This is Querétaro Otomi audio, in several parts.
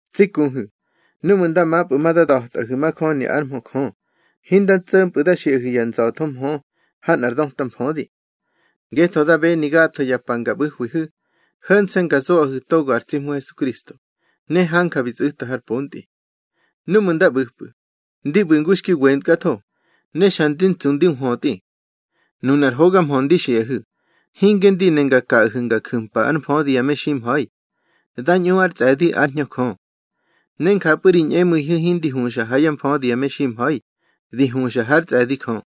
Tsi kuhu̱, núꞌmu̱ nda mapꞌu̱ ma da da̱tꞌahu̱ majöni ár mhö Jö, hinda tso̱mpꞌu̱ da xiꞌahu̱ ya nza̱tho mhö ha nꞌar döta mfödi. Ngetho da beni gatho ya pa nga ꞌbu̱hwihu̱, ho̱nse̱ nga zoꞌahu̱ togo ar tsi Hmu Hesukristo, ne hanja bi tsꞌu̱ta har pontꞌi. Núꞌmu̱ nda ꞌbu̱pꞌu̱, ndi ꞌbu̱ ngu xki wentkatho, ne xa ndi tsu ne ndi nhwötꞌi. Nunar hoga mhö ndi xiꞌahu̱, hinge ndi ne nga kaꞌahu̱ nga ju̱mpa ár mfödi ya meximha̱i. Da ñꞌu ár tsꞌe̱di ár Hñö Jö. Ne njapꞌu̱ ri ñꞌemu̱ihu̱ hindi huxa ha yá mfödi ya meximha̱i, di huxa hár tsꞌe̱di Jö.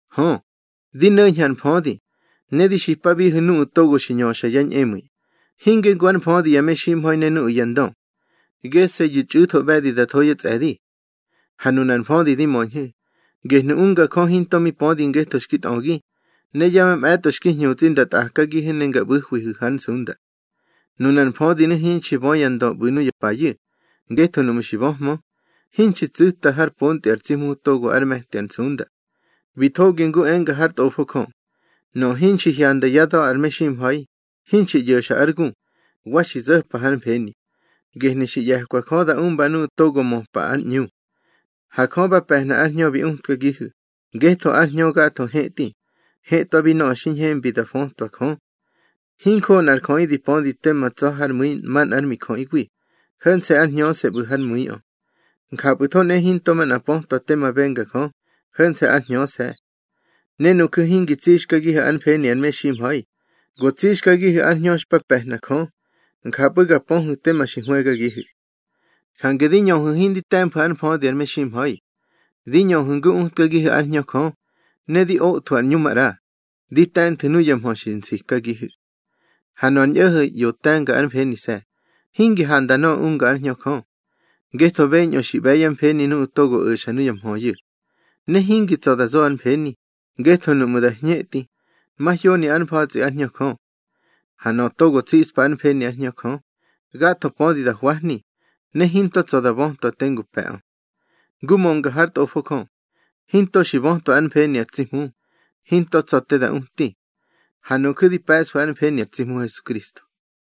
Hö, di no̱ñhu̱ ar mfödi, ne di xipabihu̱ nuꞌu̱ togo xi ñöxa yá ñꞌemu̱i, hinge ngu ár mfödi ya meximha̱i ne nuꞌu̱ yá ndö. Gese̱yu̱ txꞌu̱tho ꞌbe̱di da tho yá tsꞌe̱di. Ha nunar mfödi di möñhu̱, gehnu̱ unga Jö hinto mi pödi ngetho xki tꞌögi, ne ya mamꞌe̱tꞌo xki hñutsꞌi nda tꞌakagihu̱ ne nga ꞌbu̱hwihu̱ hár nsunda. Nunar mfödinu̱ hinxi bö ya ndö ꞌbu̱ nuya payu̱, ngetho nuꞌmu̱ xi böhmö, hinxi tsu̱ta har pontꞌi ar tsi Hmu togo ár me̱ti ar nsunda. Bi thogi ngu enga hár Tꞌofo Jö: Nöꞌö hinxi hyanda yá da̱ ar meximha̱i, hinxi ꞌyo̱xa ár gu, wa xi zo̱pa hár mfeni, gehnu̱ xi ꞌye̱kwa Jö da umba nuꞌu̱ togo möpa ár ꞌñu. Ha Jö ba pe̱hna ár Hñö bi utkagihu̱, ngetho ar Hñö gatho hetꞌi, hetꞌwabi nöꞌö xi ñhembi da fötwa Jö. Hinjoꞌo nꞌar jöꞌi di pödi tema tsa̱ hár mu̱i manꞌár mijöꞌiwi, ho̱nse̱ ár hñöse̱ ꞌbu̱ hár mu̱iꞌö. Njapꞌu̱tho nꞌehe hinto manꞌa pötwa tema benga Jö, ho̱nse̱ ár Hñöse̱. Ne nuju̱ hingi tsixkagihu̱ ár mfeni ar meximha̱i, go tsixkagihu̱ ar Hñö xpa pe̱hna Jö, njapꞌu̱ ga pöhu̱ tema xi hwëgagihu̱. Jange di ñöhu̱ hindi te̱mfu̱ ár mfödi ar meximha̱i. Di ñöhu̱ ngu utkagihu̱ ár Hñö Jö, ne di othwu̱ ar ꞌñu maꞌra, di te̱nthu̱ nuya mhö xi nsikagihu̱. Ha nöꞌö ar ñꞌo̱ho̱ ꞌyo te̱nga ár mfenise̱, hingi handa nöꞌö unga ár Hñö Jö. Ngetho beñꞌö xi ꞌbe̱ yá mfeni nuꞌu̱ togo o̱xa nuya mhöyu̱. Ne hingi tsa̱ da zo ár mfeni, ngetho nuꞌmu̱ da hñetꞌi, mahyoni ár mfa̱tsꞌi ár Hñö Jö. Ha nöꞌö togo tsiꞌspa ár mfeni ár Hñö Jö, gatho pödi da hwahni, ne hinto tsa̱ da bötwa tengu pe̱ꞌö. Ngu mönga hár Tꞌofo Jö: Hinto xi bötwa ár mfeni ar tsi Hmu, hinto tsa̱ te da uti. Ha nuju̱ di pe̱ꞌsfu̱ ár mfeni ar tsi Hmu Hesukristo.